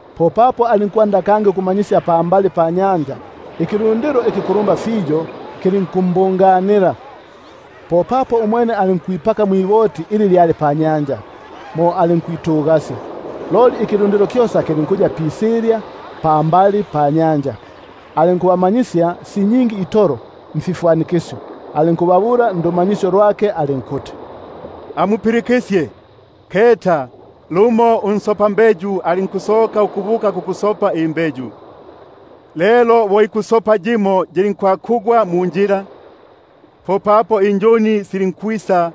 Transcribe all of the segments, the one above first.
Popapo alinkwanda kangi ukumanyisya pambali panyanja. Ikilundilo ikikulumba fiyo kilinkubungana nukunsyungutila, bunobuno alinkwingila nukutugasya mwiboti panyanja; loli ikilundilo kyosa kilinkuya pisilya pambali panyanja. Alinkubamanyisya si nyingi itolo mfifwanikisyo, alinkubabula ndumanyisyo lwake alinkuti: Amupilikisyege! Keta, lumo unsopambeyu alinkusoka ukubuka kukusopa imbeyu. Lelo bo ikusopa yimo yilinkwakugwa munjila; popapo silinkwisa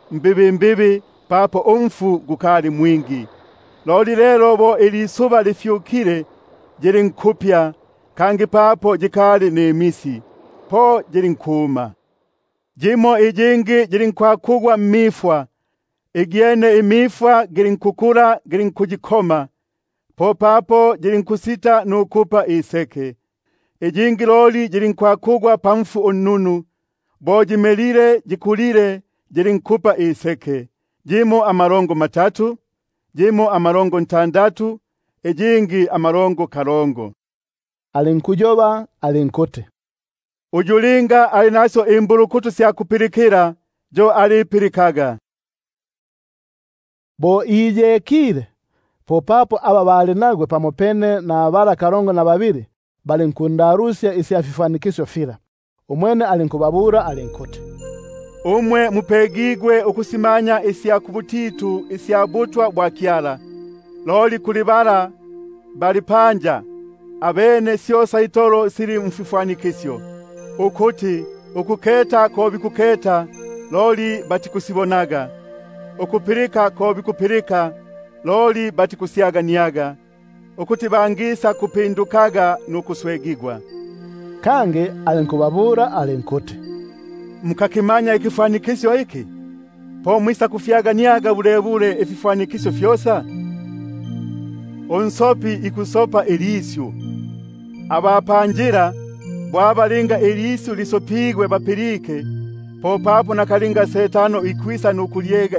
ukumela papo umfu gukali mwingi; loli bo ilisuba lifyukile yilinkupya, kangi papo yikali nimisi, po yilinkuma. Yimo iyingi yilinkwakugwa mmifwa, igyene imifwa gilinkukula gilinkuyikoma, popapo yilinkusita nukupa iseke. Iyingi loli yilinkwakugwa pakisu ikinunu, bo yimelile yikulile yilinkupa iseke, yimo amalongo matatu, yimo amalongo ntandatu, iyingi amalongo kalongo. Alinkubabula alinkuti: Uyu linga ali nasyo imbulukutu sya kupilikila, yo alipilikaga. Bo iyekile, popapo aba bali nagwe pamopene na bala kalongo na babili balinkundalusya isya fifwanikisyo fila. Umwene alinkubabula alinkuti: Umwe mupegigwe ukusimanya isya mbutitu isya butwa bwa Kyala, loli kuli aba bali panja, syosa itolo sikubisilaga mfifwanikisyo, ukuti, Ukuketa ko bikuketaga, loli batikusibonaga, Ukupilika ko bikupilika, loli batikusyagania; Ukuti bangapindukaga nukuswegigwa. Kangi alinkubabula alinkuti: Mukakimanya ikifwanikisyo iki? Po mwisakufyaganiaga bulebule ififwanikisyo fyosa? Unsopi ikusopa ilisyu. Aba panjila, bo aba linga ilisyu lisopigwe balipilike, popapo nakalinga Setano ikwisa nukulyega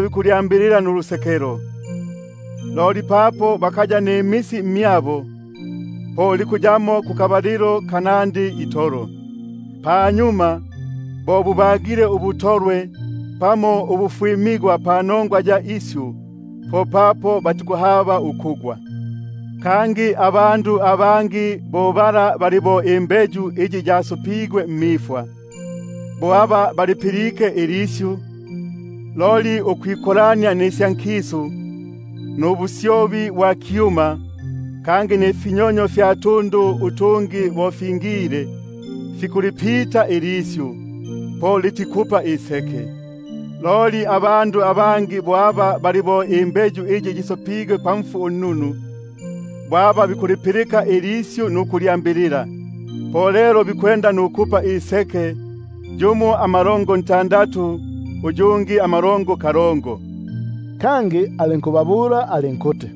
bikulyambilila nulusekelo; loli papo bakaya nimisi mmyabo, po bikuyapo akabalilo kanandi itolo. Panyuma, bo bagile ubutolwe pamo ubufwimigwa bwisile panongwa ya isyu, po papo batikuhaba ukugwa. Kangi abangi aba basopigwe mmifwa, bo aba balipilike ilisyu, loli ukwikolania nisya nkisu, nubusyobi bwa kyuma, kangi nifinyonyo fya tundu utungi bo fingile, fikulipita ilisyu, po litikupa iseke. Loli bala basopigwe pakisu ikinunu, bo aba bikupilika ilisyu nukulyambilila, po lelo bikwenda nukupa iseke; yumo amalongo matatu, yumo amalongo ntandatu, uyungi amalongo kalongo. Popapo alinkubabula alinkuti: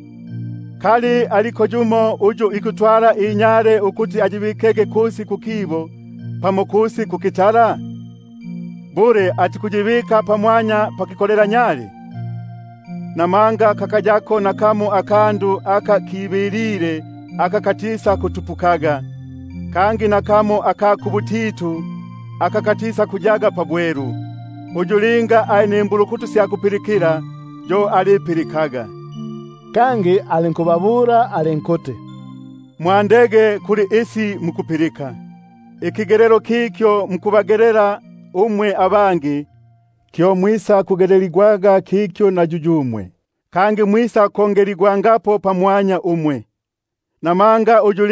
Kali aliko yumo uyu ikutwala inyale nukuyibika kusi kukitundu, pamo kusi kuki- tala? Bule atikuyibika pamwanya pakikolelanyale? Papo kakayako nakamo akandu aka kibilile aka katisakutupuka, kangi nakamo aka kubutitu aka katisakuya pabwelu. Linga yumo ali nasyo imbulukutu sya kupilikila, yo alipilikaga. Kangi alinkubabula alinkuti: Mwandege kuli isi mukusipilika. Ikigelelo kikyo mukubagelela umwe abangi, kyo mwisakugeleligwaga kikyo na yuyumwe, kangi mwisakongeleligwangapo pamwanya umwe. Namanga uyu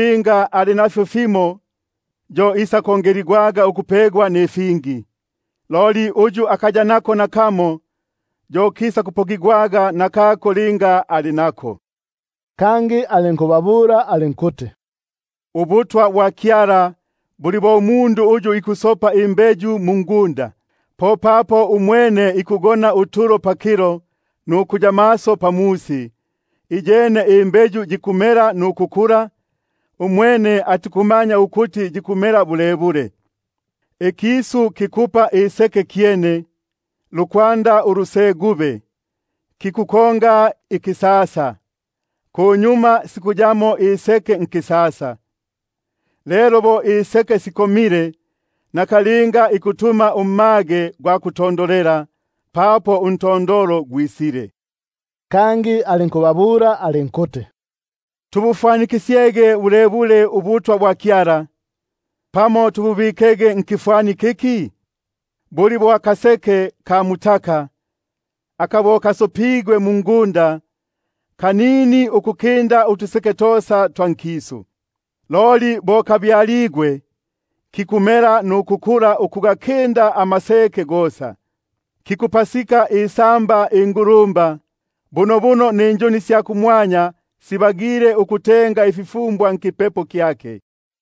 ali nako isakupegigwaga, loli uyu akaya nako, yo isakupokigwaga nakako ali nako. Kangi alinkubabula alinkuti: Ubutwa bwa Kyala buli bo umundu uyu ikusopa imbeyu mungunda, popapo umwene ikugona nukusumuka pakilo na pamusi, iyene imbeyu yikumela nukukula, umwene atikumanya ukuti yikumela bulebule. Ikisu kikupa iseke kyene, lukwanda ulusegube, kikukonga ikisasa, kunyuma sikuyamo iseke nisasa. Lelo bo iseke sikomile, nakalinga ikutuma isengo, papo untondolo gwisile. Kangi alinkubabula alinkuti: Tubufwanikisye bulebule ubutwa bwa Kyala, pamo tububike nkifwani kiki? Buli bo akaseke ka mutaka, aka linga kasopigwe mungunda, kanini ukukinda utuseke tosa twa nkisu, loli bo kasopigwe, kikumela nukukula ukugakinda amaseke gosa, kikupasika isamba ingulumba, bunobuno ninjuni sya kumwanya sibagile ukutenga ififumbwa nkipepo kyake.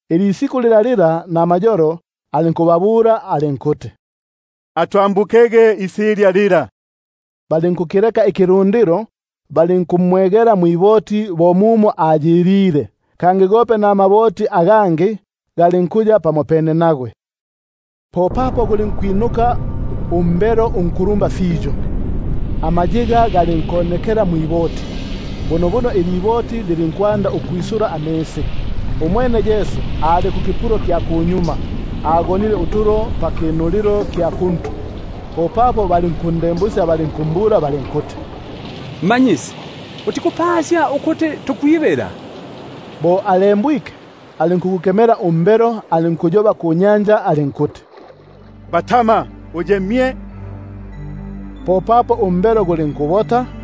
Musi gugo namayolo alinkubabula alinkuti: Atwambukege isilya lila. Balinkukileka ikilundilo, balinkumwegela mwiboti bo mumo ayilile; gope namaboti agangi galinkuya pamopene nagwe. Popapo gulinkwinuka umbelo unkulumba fiyo, amayiga galinkonekela mwiboti, bunobuno iliboti lilinkwanda ukwisula amisi. Umwene ali kumbingo, ko agonile utulo pakinulilo kya kuntu. Popapo balinkundembusya balinkumbula balinkuti: Mmanyisi, utikutupakisya ukuti tukwibila? Bo alembwike, alinkugukemela umbelo, alinkuyoba kunyanja alinkuti: Batama! uye mye. Popapo umbelo gulinkubota,